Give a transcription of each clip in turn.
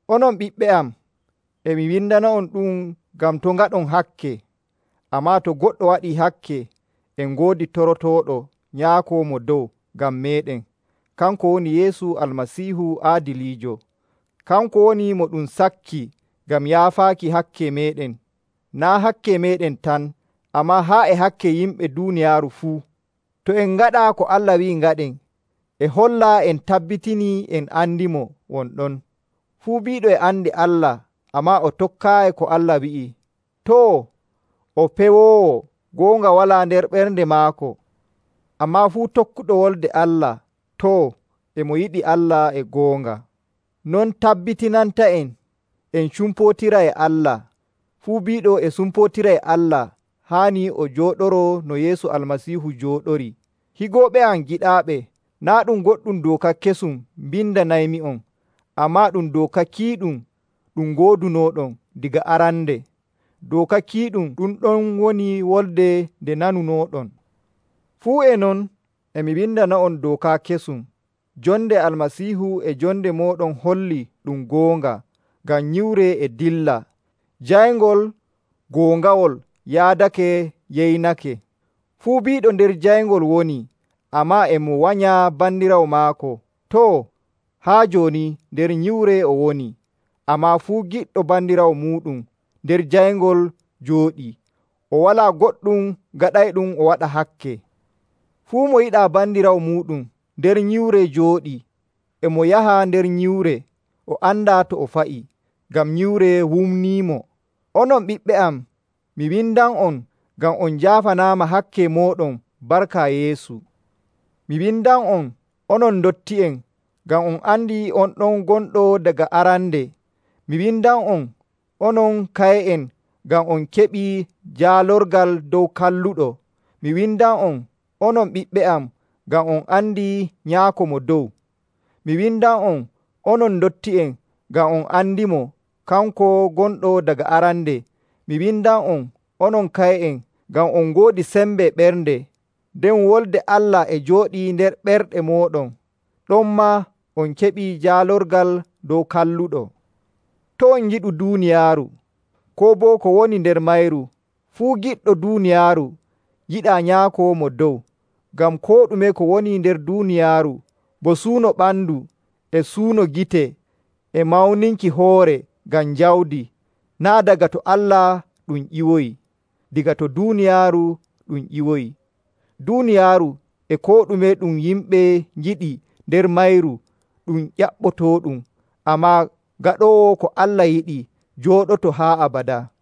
Onon ɓiɓɓe am, e mi windana'on ɗu'um ngam to' ngaɗon hakke. Ammaa to goɗɗo waɗii hakke, en ngoodi torotooɗo Nyaako Mo Dow ngam meeɗen. Kanko woni Yeesu Almasiihu aadiliijo. Kanko woni mo ɗum sakki ngam yaafaaki hakke meeɗen. Naa' hakke meeɗen tan, ammaa haa e hakke yimɓe duuniyaaru fuu. To en ngaɗa ko Allah wi'i ngaɗen, e holla en tabbitinii en andimo won ɗon. Fuu biiɗo e andi Allah, ammaa o tokkaayi ko Allah wi'i, too, o pewoowo, goonga walaa nder ɓernde maako. Ammaa fuu tokkuɗo Wolde Allah, too, e mo yiɗi Allah e goonga. Non tabbitinanta'en en cumpootira e Allah. Fuu biiɗo e sumpootira e Allah, haanii o jooɗoroo no Yeesu Almasiihu jooɗorii. Higooɓe am giɗaaɓe, naa' ɗum goɗɗum dooka kesum mbindanaymi'on, ammaa ɗum dooka kiiɗum ɗum ngoodunooɗon daga arande. Dooka kiiɗum ɗum ɗon woni wolde nde nanunooɗon. Fuu e non, e mi windana'on dooka kesum, jonde Almasiihu e jonde mooɗon hollii ɗum goonga, ngam nyiwre e dilla, jayngol goongawol yaadake yeynake. Fuu biiɗo nder jayngol woni, ammaa e mo wanya bandiraawo maako, too, haa jooni nder nyiwre o woni. Ammaa fuu giɗɗo bandiraawo muuɗum, nder jayngol jooɗii, o walaa goɗɗum gaɗayɗum o waɗa hakke. Fuu mo yiɗaa bandiraawo muuɗum, nder nyiwre jooɗii, e mo yaha nder nyiwre. O andaa to o fa'i, ngam nyiwre wumniimo. Onon ɓiɓɓe am, mi windan'on ngam on njaafanaama hakke mooɗon barka Yeesu. Mi windan'on, onon ndotti'en, ngam on andi on ɗon gonɗo daga arande. Mi windan'on, onon kaye'en, ngam on keɓii jaalorgal dow Kalluɗo. Mi windan'on, onon ɓiɓɓe am, ngam on andi Nyaako Mo Dow. Mi windan'on, onon ndotti'en, ngam on andimo, kanko gonɗo daga arande. Mi windan'on, onon kaye'en, ngam on ngoodi sembe ɓernde, nden Wolde Allah e jooɗii nder ɓerɗe mooɗon. Ɗonmaa on keɓii jaalorgal dow Kalluɗo. To' on ngiɗu duuniyaaru, koo boo ko woni nder mayru. Fuu giɗɗo duuniyaaru, yiɗaa Nyaako Mo Dow. Ngam koo ɗume ko woni nder duuniyaaru, bo suuno ɓandu, e suuno gite, e mawninki hoore ngam jawdi, naa' daga to Allah ɗum ƴiwoyi. Daga to duuniyaaru ɗum ƴiwoyi. Duuniyaaru e koo ɗume ɗum yimɓe ngiɗi nder mayru ɗum ƴaɓɓotooɗum, ammaa gaɗoowo ko Allah yiɗi jooɗoto haa abadaa.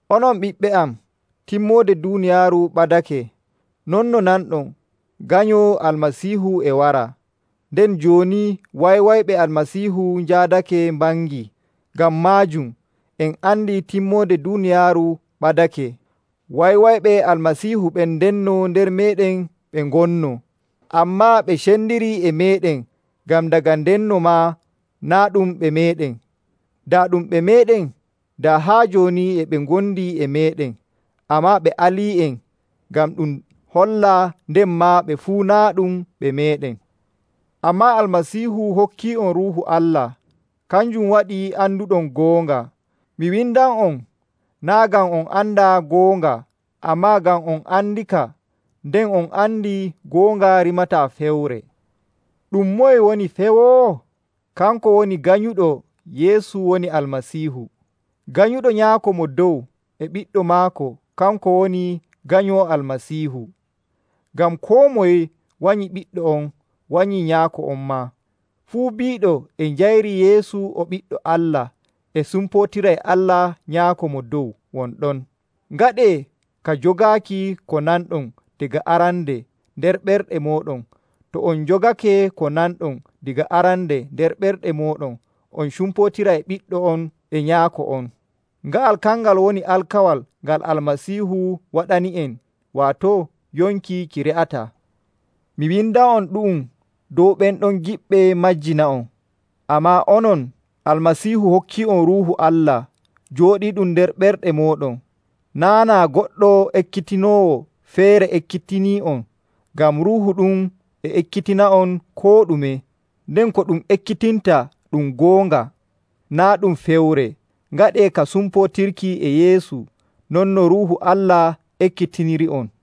Onon ɓiɓɓe am, timmoode duuniyaaru ɓadake, non no nanɗon Ganyo Almasiihu e wara. Nden jooni wanywanyɓe Almasiihu njaadake mbangii. Ngam maajum en andi timmoode duuniyaaru ɓadake. Wanywanyɓe Almasiihu ɓen ndenno nder meeɗen ɓe ngonnoo, ammaa ɓe cendirii e meeɗen ngam daga ndenno maa naa' ɗum ɓe meeɗen. Daa ɗum ɓe meeɗen, daa haa jooni e ɓe ngondi e meeɗen. Ammaa ɓe alii'en, ngam ɗum holla nden maa ɓe fuu naa' ɗum ɓe meeɗen. Ammaa Almasiihu hokkii'on Ruuhu Allah. Kanjum waɗi anduɗon goonga. Mi windan'on, naa' ngam on andaa goonga, ammaa ngam on andika, nden on andi goonga rimataa fewre. Ɗum moye woni pewoowo? Kanko woni ganyuɗo Yeesu woni Almasiihu. Ganyuɗo Nyaako Mo Dow e Ɓiɗɗo maako kanko woni ganyo Almasiihu. Ngam koo moye wanyi Ɓiɗɗo on, wanyii Nyaako on maa. Fuu biiɗo e njayri Yeesu o Ɓiɗɗo Allah, e sumpootira e Allah Nyaako Mo Dow won ɗon. Ngaɗee ka jogaaki ko nanɗon daga arande nder ɓerɗe mooɗon. To on njogake ko nanɗon daga arande nder ɓerɗe mooɗon, on cumpootira e Ɓiɗɗo on e Nyaako on. Nga'al kangal woni alkawal ngal Almasiihu waɗani'en, waato yonki ki re'ataa. Mi windan'on ɗu'um dow ɓen ɗon giɗɓe majjina'on. Ammaa onon, Almasiihu hokkii'on Ruuhu Allah, jooɗiiɗum nder ɓerɗe mooɗon. Naa' naa goɗɗo ekkitinoowo feere ekkitinii'on, ngam Ruuhu ɗum e ekkitina'on koo ɗume. Nden ko ɗum ekkitinta ɗum goonga, naa' ɗum fewre. Ngaɗee ka sumpootirki e Yeesu non no Ruuhu Allah ekkitiniri'on.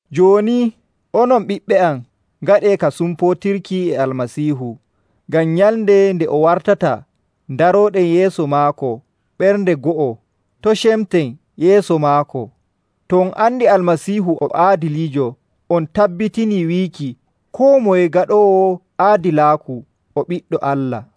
Jooni, onon ɓiɓɓe am, ngaɗee ka sumpootirki e Almasiihu, ngam nyalnde nde o wartata ndarooɗen yeeso maako ɓernde go'o, to' cemten yeeso maako. To on andi Almasiihu o aadiliijo, on tabbitinii wiiki koo moye gaɗoowo aadilaaku o ɓiɗɗo Allah.